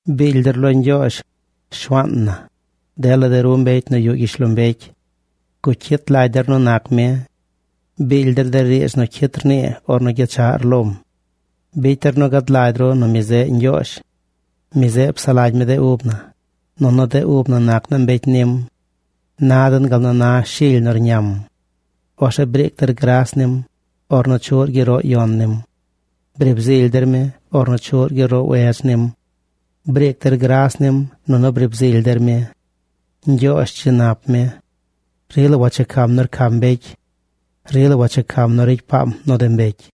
Biily der lo Ñgyoozh, Shuaan na, dela de ru mbecy nu yuꞌ gyishlombecy. Gucyit lagy der nu nac mi. Biily der de riidz nu cyit rnii ornu gyechaꞌr lom. Bicy der nu gad lagy ru nu mi zeꞌ Ñgyoozh. Mi zeꞌ psaꞌ lagy mi de ub na, nunu de ub na nac naa mbecy nim. Na den gal nu na shily nu rñam. Orzeꞌ briic der gras nim, ornu chuꞌr gyeroꞌ yon nim. Briib zily der mi ornu chuꞌr gyeroꞌ wedz nim. Briic der gras nim nunu briib zily der mi. Ñgyoozh dzi nap mi. Rila wachecam nu rcam mbecy. Rila wachecam nu ricy paam nu de mbecy.